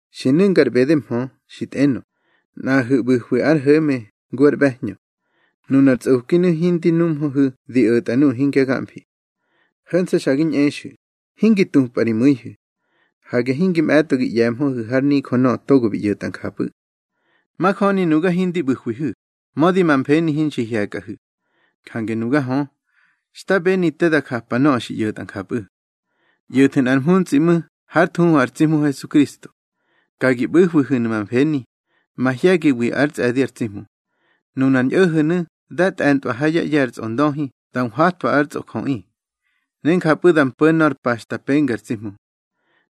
Xi nu̱nga ar ꞌbede mhö, xi tꞌenö, nꞌaꞌahu̱ ꞌbu̱hwi ár ho̱me ngu ár ꞌbe̱hñö. Nunar tsꞌokinu̱ hindi numhöhu̱ di o̱tꞌa nuꞌu̱ hingya gamfi. Ho̱nse̱ xa gi ñꞌexu̱, hingi tupꞌa ri mu̱ihu̱. Hage hinge mꞌe̱tꞌo ngi ꞌye̱mhöhu̱ har nijö nöꞌö togo bi ꞌyo̱tꞌa njapꞌu̱. Majöni nuga hindi ꞌbu̱hwihu̱, mödi ma mfeni hinxi hye̱kꞌahu̱. Jange nuga hö, xta beni te da njapa nöꞌö xi ꞌyo̱tꞌa njapꞌu̱. ꞌYo̱thu̱ nꞌar mhuntsꞌi ꞌmu̱ hár thuhu ar tsi Hmu Hesukristo. Ka gi ꞌbu̱hwihu̱nu̱ ma mfeni, mahye̱giwi ár tsꞌe̱di ar tsi Hmu. Nunar ñꞌo̱ho̱nu̱ dá tꞌe̱ntꞌwa hár ꞌye̱ ar tsꞌondöhi da nhwatwa ár tsꞌojöꞌi, ne njapꞌu̱ da mpo̱ nor pa xta penga ar tsi Hmu.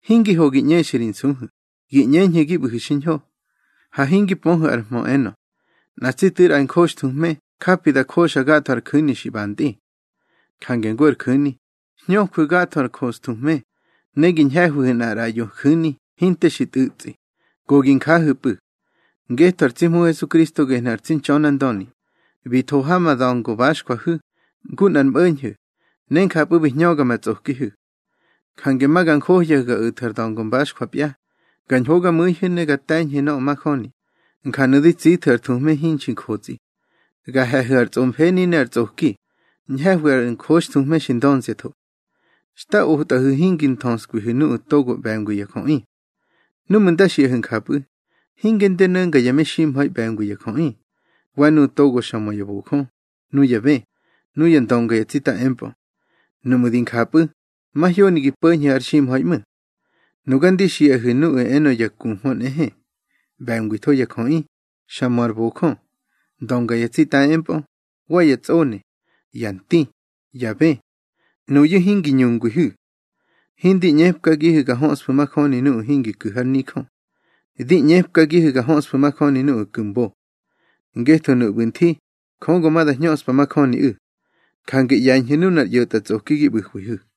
Hingi ho gi ꞌñexa ri nsuhu̱, gi ꞌñeñhu̱ gi ꞌbu̱hu̱ xiñho. Ha hingi pöhu̱ ar hmö, enö: Nꞌa tsi tu̱i ar njoxthuhme japi da joxa gatho ar ju̱ni xi ꞌbantꞌi. Jange ngu ar ju̱ni, hñöju̱ gatho ar njoxthuhme, ne gi ñhe̱hwihu̱ nꞌar ꞌraꞌyo ju̱ni hinte xi tꞌu̱tsꞌi, go gi njahu̱pꞌu̱. Ngetho ar tsi Hmu Hesukristo gehnu̱ ar tsi Ntxönandöni, bi tho ha ma da̱ngo baxjwahu̱, ngu nꞌar mꞌo̱ñho̱, ne njapꞌu̱ bi hñöga ma tsꞌokihu̱. Jange ma ga njohyahu̱ ga o̱thu̱ ar da̱ngo baxjwapya, ga ñhogamu̱ihu̱ ne ga te̱ñhu̱ nöꞌö majöni, njanu̱ di tsithu̱ ar thuhme hinxi njotsꞌi. Ga he̱hu̱ ar tsꞌomfeni ne ar tsꞌoki, ñhe̱hwi ar njoxthuhme xi ndönziatho. Xta otꞌahu̱ hingi nthöskwihu̱ nuꞌu̱ togo ꞌbe̱ngwi ya jöꞌi. Núꞌmu̱ nda xiꞌahu̱ njapꞌu̱, hinge ndi no̱nga ya meximha̱i ꞌbe̱ngwi ya jöꞌi, wa nuꞌu̱ togo xa mö ya bojö, nuya bë, nuya ndönga ya tsita empꞌö. Nuꞌmu̱ di njapꞌu̱, mahyoni gi po̱ñhu̱ har ximha̱i ꞌmu̱. Nuga ndi xiꞌahu̱ nuꞌu̱ enö ya kuhmö nꞌehe, ꞌbe̱ngwitho ya jöꞌi, xa mö ar bojö, ndönga ya tsita empꞌö, wa ya tsꞌone, ya nti, ya bë. Nuyu̱ hingi ñungwihu̱. Hindi ꞌñepkagihu̱ ga höꞌsfu̱ majoni nuꞌu̱ hingi ku̱ har nijö. Di ꞌñepkagihu̱ ga höꞌsfu̱ majöni nuꞌu̱ ku̱ mbo. Ngetho nuꞌu̱ ꞌbu̱ nthi, Jö go ma da hñöꞌspa majöniꞌu̱. Jange ꞌye̱ñhu̱ nunar ꞌyo̱tꞌatsꞌoki gi ꞌbu̱hwihu̱.